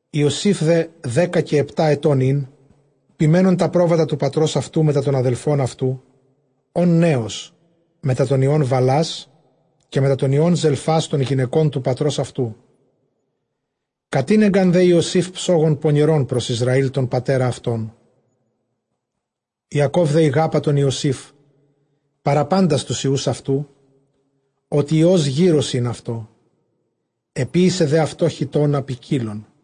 Ἰωσὴφ δὲ δέκα καὶ ἑπτὰ ἐτῶν ἦν, ποιμαίνων τὰ πρόβατα τοῦ πατρὸς αὐτοῦ μετὰ τῶν ἀδελφῶν αὐτοῦ, ὢν νέος, μετὰ τῶν υἱῶν Βαλλᾶς, καὶ μετὰ τῶν υἱῶν Ζελφᾶς, τῶν γυναικῶν τοῦ πατρὸς αὐτοῦ· κατήνεγκαν δὲ Ἰωσὴφ ψόγον πονηρὸν πρὸς Ἰσραὴλ τὸν πατέρα αὐτῶν. Ἰακὼβ δὲ ἠγάπα τὸν Ἰωσὴφ παρὰ πάντας τοὺς υἱοὺς αὐτοῦ, ὅτι υἱὸς γήρως ἦν αὐτῷ· ἐποίησε δὲ αὐτῷ χιτῶνα ποικίλον.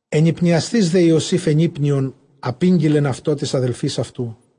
Ἐνυπνιασθεὶς δὲ Ἰωσὴφ ἐνύπνιον, ἀπήγγειλεν αὐτὸ τοῖς ἀδελφοῖς αὐτοῦ.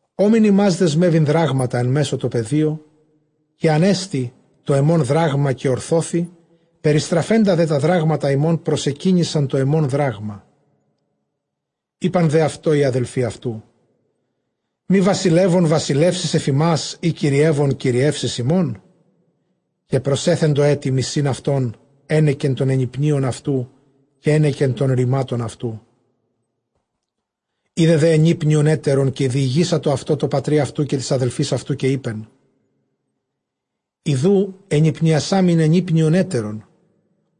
Ὤμην ὑμᾶς δεσμεύειν δράγματα ἐν μέσῳ τῷ πεδίῳ· καὶ ἀνέστη τὸ ἐμὸν δράγμα, καὶ ὠρθώθη· περιστραφέντα δὲ τὰ δράγματα ὑμῶν, προσεκύνησαν τὸ ἐμὸν δράγμα. Εἶπαν δὲ αὐτῷ οἱ ἀδελφοὶ αὐτοῦ, μὴ βασιλεύων βασιλεύσεις ἐφʼ ἡμᾶς, ἢ κυριεύων κυριεύσεις ἡμῶν, καὶ προσέθεντο ἔτι μισεῖν αὐτὸν ἕνεκεν τῶν ἐνυπνίων αὐτοῦ, καὶ ἕνεκεν τῶν ῥημάτων αὐτοῦ. Εἶδε δὲ ἐνύπνιον ἕτερον, καὶ διηγήσατο αὐτὸ τῷ πατρὶ αὐτοῦ, καὶ τοῖς ἀδελφοῖς αὐτοῦ· καὶ εἶπεν, ἰδοὺ ἐνυπνιασάμην ἐνύπνιον ἕτερον·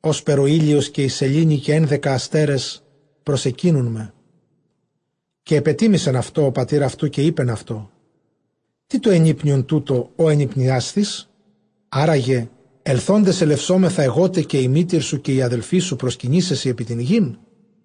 ὥσπερ ὁ ἥλιος, καὶ ἡ σελήνη, καὶ ἕνδεκα ἀστέρες προσεκύνουν με. Καὶ ἐπετίμησεν αὐτῷ ὁ πατὴρ αὐτοῦ, καὶ εἶπεν αὐτῷ, τί τὸ ἐνύπνιον τοῦτο, ὃ ἐνυπνιάσθης; ἆρά γε ἐλθόντες ἐλευσόμεθα ἐγώ τε καὶ ἡ μήτηρ σου καὶ οἱ ἀδελφοί σου προσκυνῆσαί σοι ἐπὶ τὴν γῆν;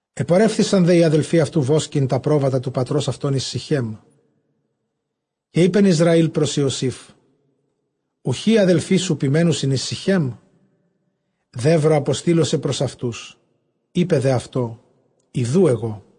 Ἐπορεύθησαν δὲ οἱ ἀδελφοὶ αὐτοῦ βόσκειν τὰ πρόβατα τοῦ πατρὸς αὐτῶν εἰς Συχέμ. Καὶ εἶπεν Ἰσραὴλ πρὸς Ἰωσὴφ, οὐχὶ οἱ ἀδελφοί σου ποιμαίνουσιν εἰς Συχέμ; δεῦρο ἀποστείλω σε πρὸς αὐτούς· εἶπε δὲ αὐτῷ, ἰδοὺ ἐγώ.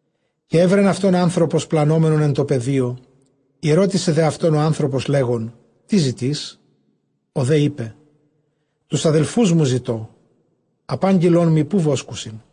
Καὶ εὗρεν αὐτὸν ἄνθρωπος πλανώμενον ἐν τῷ πεδίῳ· ἠρώτησε δὲ αὐτὸν ὁ ἄνθρωπος, λέγων, τί ζητεῖς; Ὁ δὲ εἶπε, τοὺς ἀδελφούς μου ζητῶ· ἀπάγγειλόν μοι ποῦ βόσκουσιν.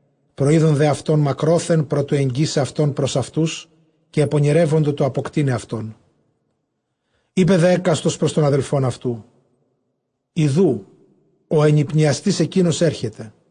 Προεῖδον δὲ αὐτὸν μακρόθεν πρὸ τοῦ ἐγγίσαι αὐτὸν πρὸς αὐτούς· καὶ ἐπονηρεύοντο τοῦ ἀποκτεῖναι αὐτόν. Εἶπε δὲ ἕκαστος πρὸς τὸν ἀδελφὸν αὐτοῦ, ἰδοὺ ὁ ἐνυπνιαστὴς ἐκεῖνος ἔρχεται.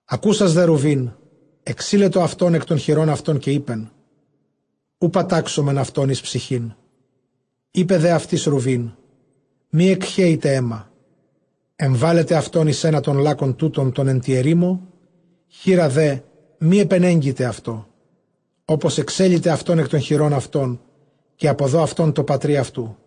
Ἀκούσας δὲ Ῥουβὴν, ἐξείλετο αὐτὸν ἐκ τῶν χειρῶν αὐτῶν· καὶ εἶπεν, οὐ πατάξωμεν αὐτὸν εἰς ψυχήν. Εἶπε δὲ αὐτοῖς Ῥουβὴν, μὴ ἐκχέητε αἷμα· ἐμβάλλετε αὐτὸν εἰς ἕνα τῶν λάκκων τούτων τῶν ἐν τῇ ἐρήμῳ, χεῖρα δὲ μὴ ἐπενέγκητε αὐτῷ· ὅπως ἐξέληται αὐτὸν ἐκ τῶν χειρῶν αὐτῶν, καὶ ἀποδῷ αὐτὸν τῷ πατρὶ αὐτοῦ.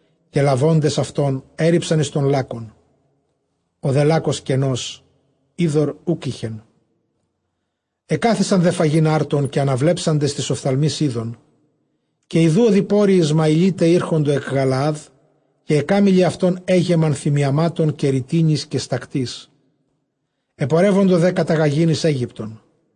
Καὶ λαβόντες αὐτὸν, ἔῤῥιψαν εἰς τὸν λάκκον· ὁ δὲ λάκκος κενὸς, ὕδωρ οὐκ εἶχε. Ἐκάθισαν δὲ φαγεῖν ἄρτον· καὶ ἀναβλέψαντες τοῖς ὀφθαλμοῖς εἶδον, καὶ ἰδοὺ ὁδοιπόροι Ἰσμαηλῖται ἤρχοντο ἐκ Γαλαάδ· καὶ αἱ κάμηλοι αὐτῶν ἔγεμον θυμιαμάτων καὶ ῥητίνης καὶ στακτῆς. ἐπορεύοντο δὲ καταγαγεῖν εἰς Αἴγυπτον.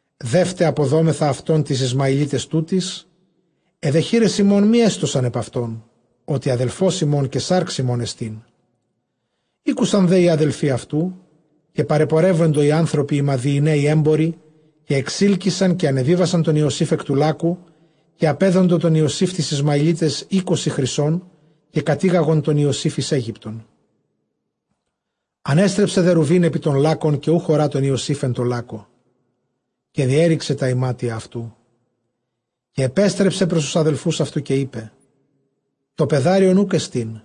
Δεῦτε ἀποδώμεθα αὐτὸν τοῖς Ἰσμαηλίταις τούτοις· αἱ δὲ χεῖρες ἡμῶν μὴ ἔστωσαν ἐπʼ αὐτὸν, ὅτι ἀδελφὸς ἡμῶν καὶ σὰρξ ἡμῶν ἐστίν. Ἤκουσαν δὲ οἱ ἀδελφοὶ αὐτοῦ. Καὶ παρεπορεύοντο οἱ ἄνθρωποι οἱ Μαδιηναῖοι ἔμποροι, καὶ ἐξείλκυσαν καὶ ἀνεβίβασαν τὸν Ἰωσὴφ ἐκ τοῦ λάκκου· καὶ ἀπέδοντο τὸν Ἰωσὴφ τοῖς Ἰσμαηλίταις εἴκοσι χρυσῶν. Καὶ κατήγαγον τὸν Ἰωσὴφ εἰς Αἴγυπτον. Ἀνέστρεψε δὲ Ῥουβὴν ἐπὶ τὸν λάκκον, καὶ οὐχ ὁρᾷ τὸν Ἰωσὴφ ἐν τῷ λάκκῳ· καὶ διέῤῥηξε τὰ ἱμάτια αὐτοῦ. Καὶ ἐπέστρεψε πρὸς τοὺς ἀδελφοὺς αὐτοῦ, καὶ εἶπε, τὸ παιδάριον οὐκ ἔστιν·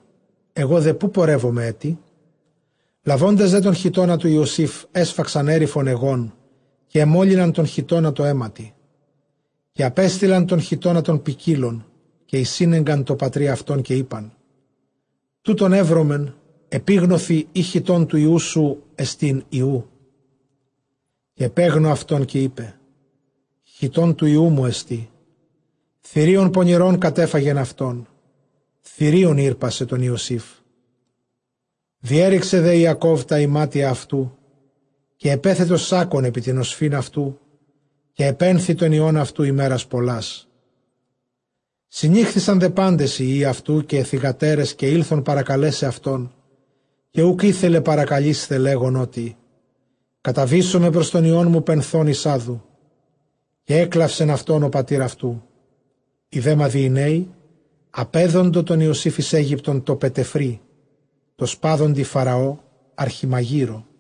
ἐγὼ δὲ ποῦ πορεύομαι ἔτι; Λαβόντες δὲ τὸν χιτῶνα τοῦ Ἰωσὴφ, ἔσφαξαν ἔριφον αἰγῶν, καὶ ἐμόλυναν τὸν χιτῶνα τῷ αἵματι. Καὶ ἀπέστειλαν τὸν χιτῶνα τὸν ποικίλον, καὶ εἰσήνεγκαν τῷ πατρὶ αὐτῶν· καὶ εἶπαν, τοῦτον εὕρομεν, ἐπίγνωθι εἰ χιτὼν τοῦ υἱοῦ σου ἐστὶν, ἢ οὔ. Καὶ ἐπέγνω αὐτὸν, καὶ εἶπε, χιτὼν τοῦ υἱοῦ μου ἐστί· θηρίον πονηρὸν κατέφαγεν αὐτόν· θηρίον ἥρπασε τὸν Ἰωσήφ. Διέῤῥηξε δὲ Ἰακὼβ τὰ ἱμάτια αὐτοῦ, καὶ ἐπέθετο σάκκον ἐπὶ τὴν ὀσφῦν αὐτοῦ, καὶ ἐπένθει τὸν υἱὸν αὐτοῦ ἡμέρας πολλάς. Συνήχθησαν δὲ πάντες οἱ υἱοὶ αὐτοῦ καὶ αἱ θυγατέρες, καὶ ἦλθον παρακαλέσαι αὐτόν· καὶ οὐκ ἤθελε παρακαλεῖσθαι, λέγων, ὅτι καταβήσομαι πρὸς τὸν υἱόν μου πενθῶν εἰς ᾅδου· καὶ ἔκλαυσεν αὐτὸν ὁ πατὴρ αὐτοῦ. Οἱ δὲ Μαδιηναῖοι ἀπέδοντο τὸν Ἰωσὴφ εἰς Αἴγυπτον τῷ Πετεφρῇ τῷ σπάδοντι Φαραὼ ἀρχιμαγείρῳ.